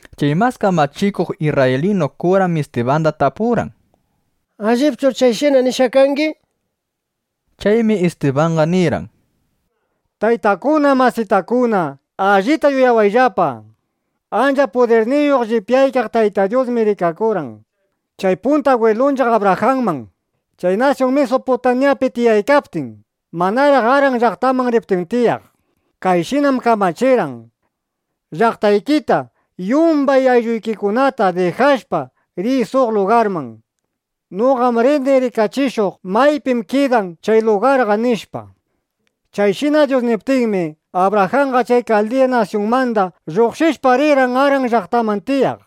Chay mas kamachikuq isrraylinu kuram Istibanda tapurqan: —¿Allipchur chayshina nishqa kangi? nishpa. Chaymi Istibanqa nirqan: —Taytakuna, masitakuna, allita uyawayllapa. Ancha pudirniyuq llipyaykaq Tayta Dyusmi rikakurqan chay punta agwilunchiq Abrajanman, chay nasyun Misuputamyapi tiyaykaptin, manaraq Aran llaqtaman riptin tiyaq. Kayshinam kamachirqan: “Llaqtaykita, yumbay aylluykikunata dijashpa, riy suq lugarman. Noqam rini rikachishuq maypim kidan chay lugarqa”, nishpa. Chayshina Dyus niptinmi, Abrajanqa chay Kaldiya nasyunmanda lluqshishpa, rirqan Aran llaqtaman tiyaq.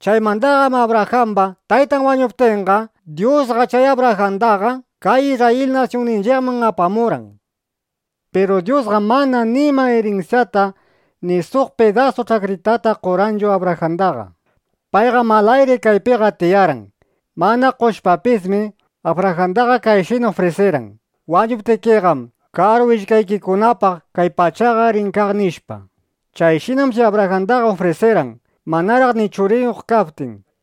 Chaymandaqam Abrajamba taytan wañuptinqa, Dyusqa chay Abrajandaqa kay Isrrayil nasyunninchiqman apamurqan. Piru Dyusqam mana nima irinsyata ni suq pidasu ch'akritata qorqanchu Abrajandaqa. Payqam alayri kaypiqa tiyarqan. Mana qoshpapismi, Abrajandaqa kayshina ufrisirqan: “Wañuptikiqam, karu willkaykikunapaq kay pachaqa rin kaq”, nishpa. Chayshinam chay Abrajandaqa ufrisirqan, manaraq ni churiyuq kaptin.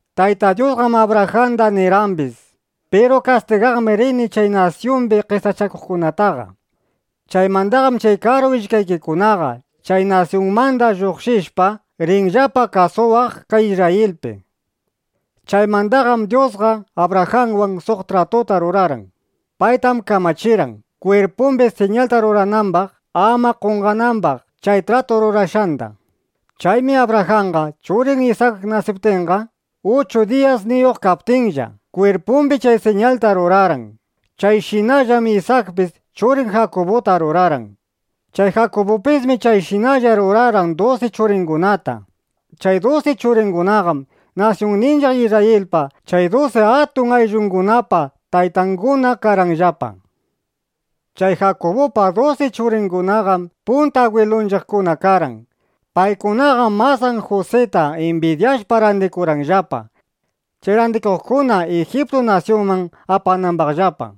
’Tayta Dyusqam Abrajandaqa nirqambis: “Piru kastigaqmi rini chay nasyumbi qesachakuqkunataqa. Chaymandaqam chay karu willkaykikunaqa, chay nasyunmanda lluqshishpa, rinllapa kasuwaq kay Isrrayilpi”, nishpa. Chaymandaqam Dyusqa Abrajanwan suq tratuta rurarqan. Paytam kamachirqan, kwirpumbi siñalta ruranambaq, ama qonqanambaq chay tratu rurashqanda. Chaymi Abrajanqa churin Isak nasiptinqa, uchu diyasniyuq kaptinlla, kwirpumbi chay siñalta rurarqan. Chayshinallam Isakpis churin Jakubuta rurarqan. Chay Jakubupismi chayshinalla rurarqan dusi churingunata. Chay dusi churingunaqam nasyunninchiq Isrrayilpa chay dusi atun ayllungunapa taytanguna karqanllapa. ’Chay Jakubupa dusi churingunaqam punta agwilunchiqkuna karqan. Paykunaqam masan Jusita imbidyashpa randikurqanllapa, chay randiqkuna Ijiptu nasyunman apanambaqllapa.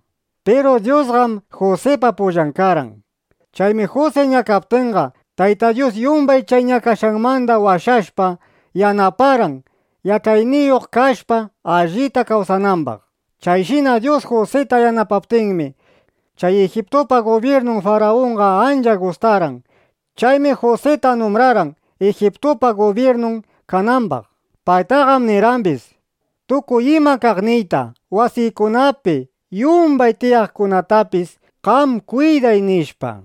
Piru Dyusqam Jusipa pullan karqan. Chaymi Jusi ñakaptinqa, Tayta Dyus yumbay chay ñakashqanmanda washashpa, yanaparqan, yach'ayniyuq kashpa, allita kawsanambaq. Chayshina Dyus Jusita yanapaptinmi, chay Ijiptupa gubyirnun Farunqa ancha gustarqan. Chaymi Jusita numbrarqan, Ijiptupa gubyirnun kanambaq. Paytaqam nirqambis: “Tukuy ima kaqniyta, wasiykunapi yumbay tiyaqkunatapis qam kwiday”, nishpa.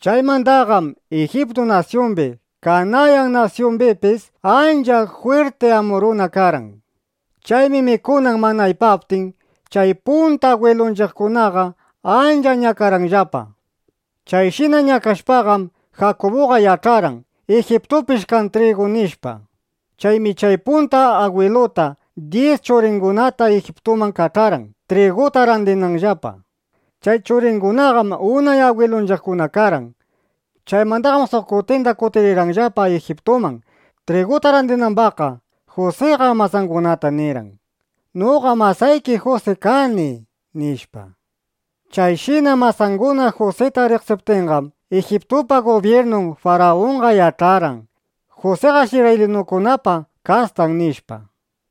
’Chaymandaqam Ijiptu nasyumbi Kanayan nasyumbipis ancha jwirti ambruna karqan. Chaymi mikunan mana aypaptin, chay punta agwilunchiqkunaqa ancha ñakarqanllapa. Chayshina ñakashpaqam, Jakubuqa yach'arqan: Ijiptupish kan trigu, nishpa. Chaymi chay punta bwiltata dyis churingunata Ijiptuman kach'arqan, triguta randinanllapa. Chay churingunaqam unay agwilunchiqkuna karqan. Chaymandaqam suq kutinda kutiriptinllapa Ijiptuman, triguta randirinambaqqa, Jusiqa masangunata nirqan: “Noqam masayki Jusi kani”, nishpa. Chayshina masanguna Jusita riqsiptinqam, Ijiptupa gubyirnun Farunqa yach'arqan: Jusiqash isrraylinukunapa kastan, nishpa.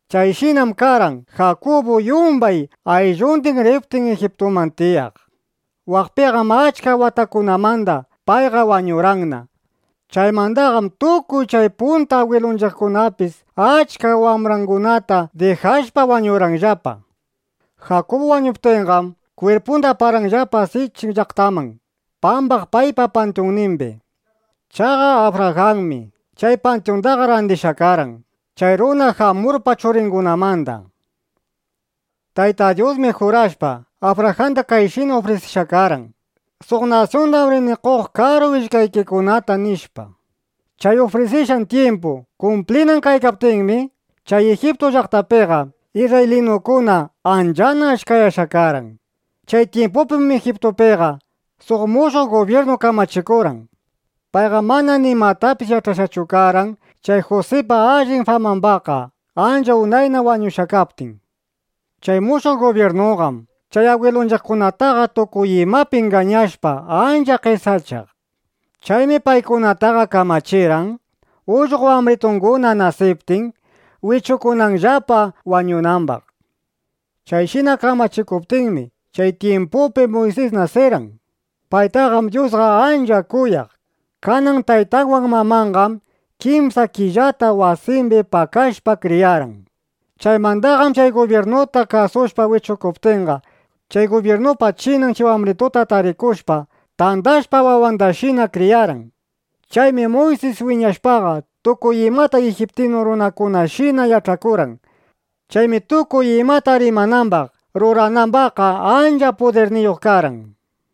Chayshinam karqan, Jakubu yumbay ayllundin riptin Ijiptuman tiyaq. Waqpinam achka watakunamanda payqa wañurqanna. Chaymandaqam tukuy chay punta agwilunchiqkunapis achka wambrangunata dijashpa, wañurqanllapa. Jakubu wañuptinqam, kwirpunda aparqanllapa Sichin llaqtaman pambaq paypa pantyunnimbi. Chaqa Abrajanmi chay pantyundaqa randishqa karqan chay runa Jamurpa churingunamanda. ’Tayta Dyusmi jurashpa, Abrajanda kayshina ufrisishqa karqan: “Suq nasyundam rini qoq karu willkaykikunata”, nishpa. Chay ufrisishqan tyimpu kumplinan kaykaptinmi, chay Ijiptu llaqtapiqa isrraylinukuna anchana achkayashqa karqan. Chay tyimpupim Ijiptupiqa suq mushuq gubyirnu kamachikurqan. Payqam mana nimatapis yach'ashqachu karqan chay Jusipa allin famambaqqa, ancha unayna wañushqa kaptin. Chay mushuq gubyirnuqam chay agwilunchiqkunataqa tukuy imapi ingañashpa, ancha qesachaq. Chaymi paykunataqa kamachirqan, ullqo wambritunguna nasiptin, wichukunanllapa wañunambaq. ’Chayshina kamachikuptinmi, chay tyimpupi Muysis nasirqan. Paytaqam Dyusqa ancha kuyaq. Kanan taytanwan mamanqam kimsa killata wasimbi pakashpa, kriyarqan. Chaymandaqam (chay gubyirnuta kasushpa) wichukuptinqa, chay gubyirnupa chinan chay wambrituta tarikushpa, tandashpa, wawandashina kriyarqan. Chaymi Muysis wiñashpaqa, tukuy imata ijiptinu runakunashina yach'akurqan. Chaymi tukuy imata rimanambaq, ruranambaqqa ancha pudirniyuq karqan.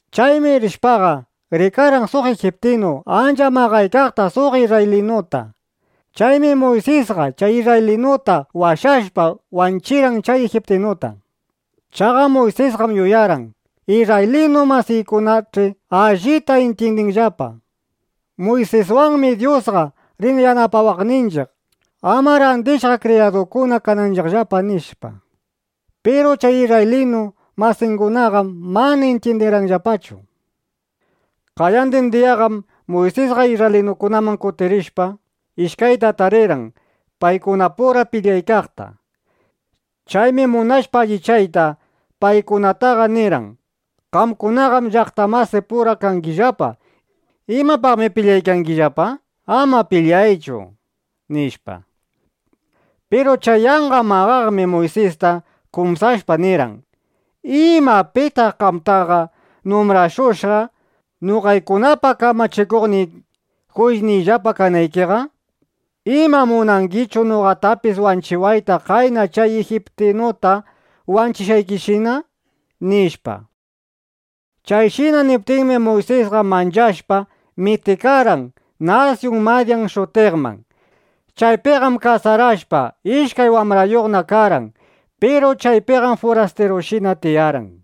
Chaymi rishpaqa, rikarqan suq ijiptinu ancha maqaykaqta suq isrraylinuta. Chaymi Muysisqa chay isrraylinuta washashpa, wanchirqan chay ijiptinuta. Chaqa Muysisqam yuyarqan: Isrraylinu masiykunach'i allita intyindinqallapa: Muysiswanmi Dyusqa rin yanapawaqninchiq, ama randishqa kriyadukuna kananchiqllapa, nishpa. Piru chay isrraylinu masingunaqam mana intyindirqanllapachu. Qayandin diyaqam Muysisqa isrraylinukunaman kutirishpa, ishkayta tarirqan paykunapura pilyaykaqta. Chaymi munashpa alliyachiyta, paykunataqa nirqan: “Qamkunaqam llaqta masipura kangillapa. ¿Imapaqmi pilyaykangillapa? Ama pilyayllapachu”, nishpa. ’Piru chay yanqa maqaqmi Muysista kumsashpa, nirqan: “¿Ima pitaq qamtaqa numbrashushqa, noqaykunapa kamachikuqniy, juyisniyllapa kanaykiqa? ¿Ima munangichu noqatapis wanchiwayta qayna chay ijiptinuta wanchishqaykishina?” nishpa. Chayshina niptinmi, Muysisqa manchashpa, mitikarqan nasyun Madyan shutiqman. Chaypiqam kasarashpa, ishkay wambrayuqna karqan. Piru chaypiqam furastirushina tiyarqan.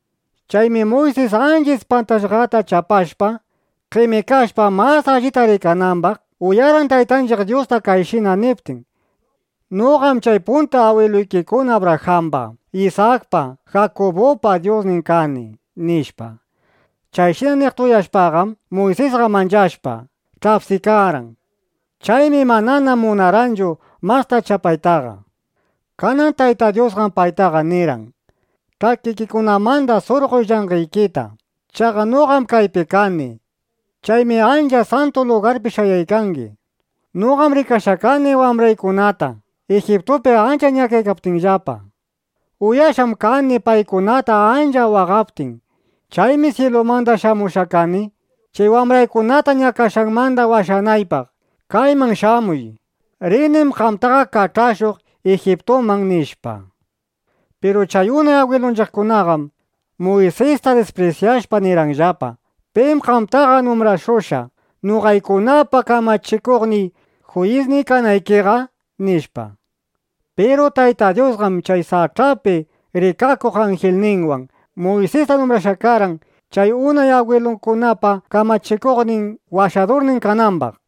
Chaymi Muysis ancha ispantashqata chapashpa, qemikashpa mas allita rikanambaq, uyarqan Taytanchiq Dyusta kayshina niptin: “Noqam chay punta agwiluykikuna Abrajamba, Isakpa, Jakubupa Dyusnin kani”, nishpa. Chayshina niqta uyashpaqam, Muysisqa manchashpa, ch'apsikarqan. Chaymi manana munarqanchu masta chapaytaqa. Kanan Tayta Dyusqam paytaqa nirqan: “Ch'akikikunamanda surqoy llanqeykita. Chaqa noqam kaypi kani. Chaymi ancha santu lugarpi shayaykangi. Noqam rikashqa kani wambraykunata Ijiptupi ancha ñakaykaptinllapa. Uyashqam kani paykunata ancha waqaptin. Chaymi syilumanda shamushqa kani, chay wambraykunata ñakashqanmanda washanaypaq. Kayman shamuy. Rinim qamtaqa kach'ashuq Ijiptuman”, nishpa. ’Piru chay unay agwilunchiqkunaqam Muysista disprisyashpa, nirqanllapa: “¿Pim qamtaqa numbrashushqa, noqaykunapa kamachikuqniy, juyisniy kanaykiqa?” nishpa. Piru Tayta Dyusqam chay sach'api rikakuq anjilninwan Muysista numbrashqa karqan, chay unay agwilunchiqkunapa kamachikuqnin, washadurnin kanambaq.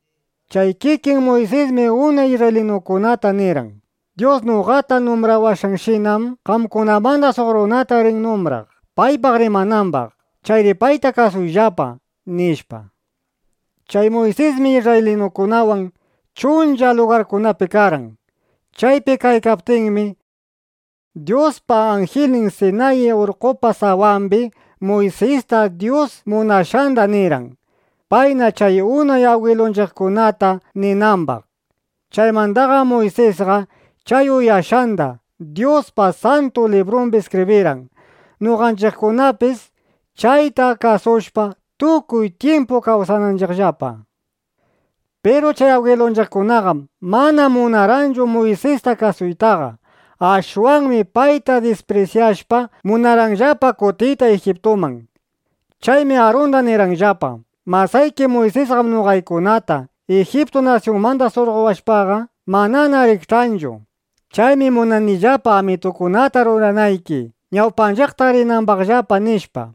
Chay kikin Muysismi unay isrraylinukunataqa nirqan: “Dyus noqata numbrawashqanshinam, qamkunamanda suq runata rin numbraq, paypaq rimanambaq. Chayri payta kasuyllapa”, nishpa. Chay Muysismi isrraylinukunawan chuncha lugarkunapi karqan. Chaypi kaykaptinmi, Dyuspa anjilnin Sinayi urqqopa sawambi Muysista Dyus munashqanda nirqan, payna chay unay agwilunchiqkunata ninambaq. Chaymandaqam Muysisqa chay uyashqanda Dyuspa Santu Librumbi iskibrirqan, noqanchiqkunapis chayta kasushpa, tukuy tyimpu kawsananchiqllapa. ’Piru chay agwilunchiqkunaqam mana munarqanchu Muysista kasuytaqa. Ashwanmi payta disprisyashpa, munarqanllapa kutiyta Ijiptuman. Chaymi Arunda nirqanllapa: “Masayki Muysisqam noqaykunata Ijiptu nasyunmanda surqowashpaqa, manana rikch'anchu. Chaymi munanillapa amitukunata ruranayki, ñawpanchiqta rinambaqllapa”, nishpa.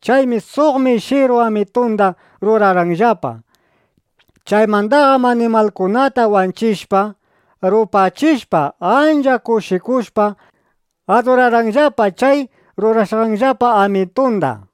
Chaymi suq mishiru amitunda rurarqanllapa. Chaymandaqam animalkunata wanchishpa, rupachishpa, ancha kushikushpa, adurarqanllapa chay rurashqanllapa amitunda.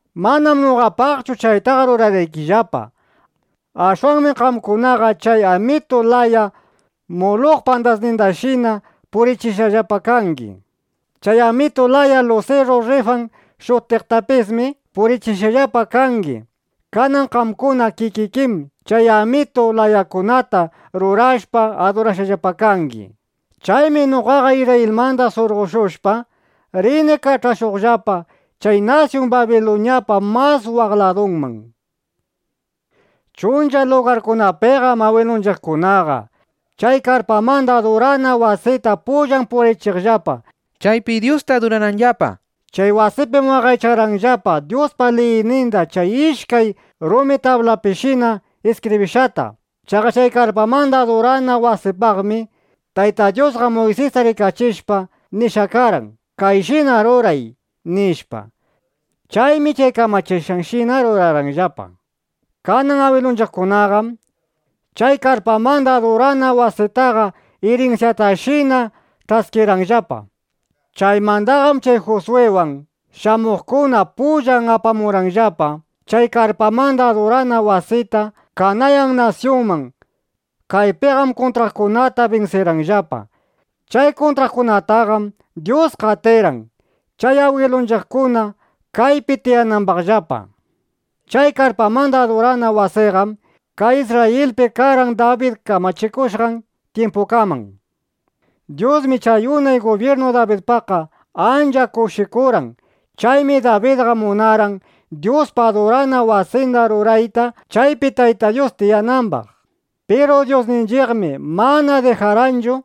Manam noqapaqchu chaytaqa rurarqaykillapa. Ashwanmi qamkunaqa chay amitu laya Muluqpa andasninda purichishqallapa kangi. Chay amitu laya lusiru Rrifan shutiqtapismi purichishqallapa kangi. Kanan qamkuna kikikim chay amitu layakunata rurashpa, adurashqallapa kangi. Chaymi noqaqa Isrrayilmanda surqoshushpa, rini kach'ashuqllapa chay nasyun Babiluñapa mas waq ladunman, nishpa. ’Chuncha lugarkunapiqam agwilunchiqkunaqa chay karpamanda adurana wasita pullan purichiqllapa, chaypi Dyusta adurananllapa. Chay wasipim waqaychaqllapa Dyuspa liyninda chay ishkay rumi tablapishina iskibrishqata. Chaqa chay karpamanda adurana wasipaqmi Tayta Dyusqa Muysista rikachishpa nishqa karqan: “Kayshina ruray”, nishpa. Chaymi chay kamachishqanshina rurarqanllapa. Kanan agwilunchiqkunaqam chay karpamanda adurana wasitaqa irinsyatashina ch'askirqanllapa. Chaymandaqam chay Juswiwan shamuqkuna pullan apamurqanllapa chay karpamanda adurana wasita kay (Kanayan) nasyunman. Kaypiqam kuntraqkunata binsirqanllapa. Chay kuntraqkunataqam Dyus qatirqan, chay agwilunchiqkuna kaypi tiyanambaqllapa. Chay karpamanda adurana wasiqam kay Isrrayilpi karqan Dabid kamachikushqan tyimpukaman. Dyusmi chay unay gubyirnu Dabidpaqqa ancha kushikurqan. Chaymi Dabidqa munarqan Dyuspa adurana wasinda rurayta, chaypi Tayta Dyus tiyanambaq. (Piru Dyusninchiqmi mana dijarqanchu,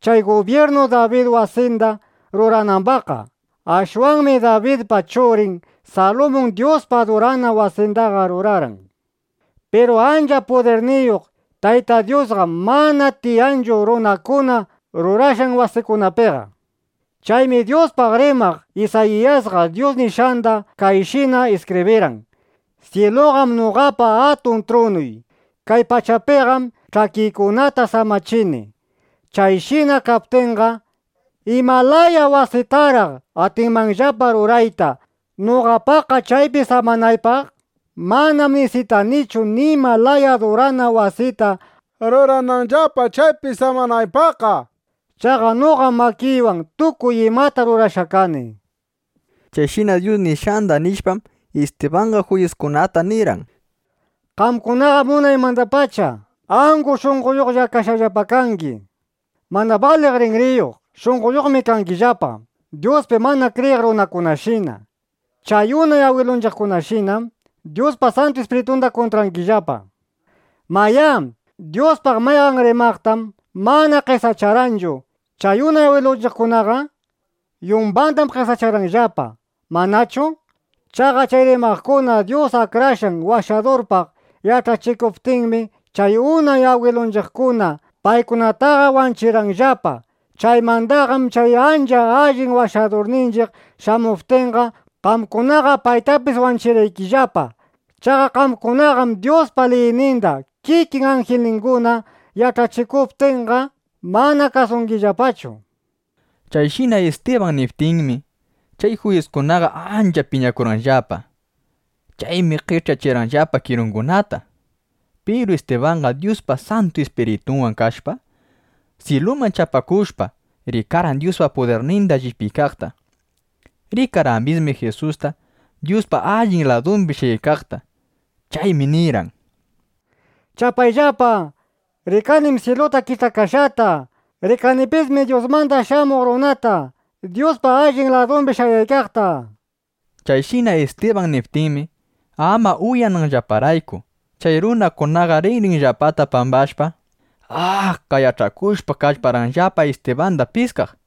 chay gubyirnu Dabid wasinda ruranambaqqa.) Ashwanmi Dabidpa churin Salumun Dyuspa adurana wasindaqa rurarqan. Piru ancha pudirniyuq Tayta Dyusqam mana tiyanchu runakuna rurashqan wasikunapiqa. Chaymi Dyuspaq rimaq Isayiyasqa Dyus nishqanda kayshina iskibrirqan: Syiluqam noqapa atun trunuy. Kay pachapiqam ch'akiykunata samachini. Chayshina kaptinqa, ¿ima laya wasiytaraq atinmanllapa rurayta noqapaqqa, chaypi samanaypaq? (Manam nisitanichu nima laya adurana wasita rurananllapa, chaypi samanaypaqqa.) Chaqa noqam makiywan tukuy imata rurashqa kani, nishpa. Chayshina Dyus nishqanda nishpam, Istibanqa juyiskunata nirqan: —Qamkunaqam unaymandapacha angu shunqoyuqlla kashqallapa kangi. Mana baliq rinriyuq, shunqoyuqmi kangillapa, Dyuspi mana kriyiq runakunashina. Chay unay agwilunchiqkunashinam Dyuspa Santu Ispiritunda kuntrangillapa. Mayá, ¿Dyuspaq mayqan rimaqtam mana qesacharqanchu chay unay agwilunchiqkunaqa? Yumbandam qesacharqanllapa, ¿manachu? Chaqa chay rimaqkuna Dyus Akrashqan Washadurpaq yach'achikuptinmi, chay unay agwilunchiqkuna paykunataqa wanchirqanllapa. Chaymandaqam chay ancha allin Washadurninchiq shamuptinqa, qamkunaqa paytapis wanchirqaykillapa. Chaqa qamkunaqam Dyuspa liyninda kikin anjilninguna yach'achishuptinqa, mana kasungillapachu. Chayshina Istiban niptinmi, chay juyiskunaqa ancha piñakurqanllapa. Chaymi qech'yachirqanllapa kirungunata. Piru Istibanqam Dyuspa Santu Ispiritunwan kashpa, syiluman chapakushpa, rikarqan Dyuspa pudirninda llipyaykaqta. Rikarqambismi Jisusta, Dyuspa allin ladumbi shayaykaqta. Chaymi nirqan: —¡Chapayllapa! Rikanim syiluta kich'akashqata. Rikanipismi Dyusmanda Shamuq Runata, Dyuspa allin ladumbi shayaykaqta, nishpa. Chayshina Istiban niptinmi, ama uyananllaparayku, chay runakunaqa rinrinllapata pambashpa, “¡A!” qayach'akushpa, kallparqanllapa Istibanda piskaq.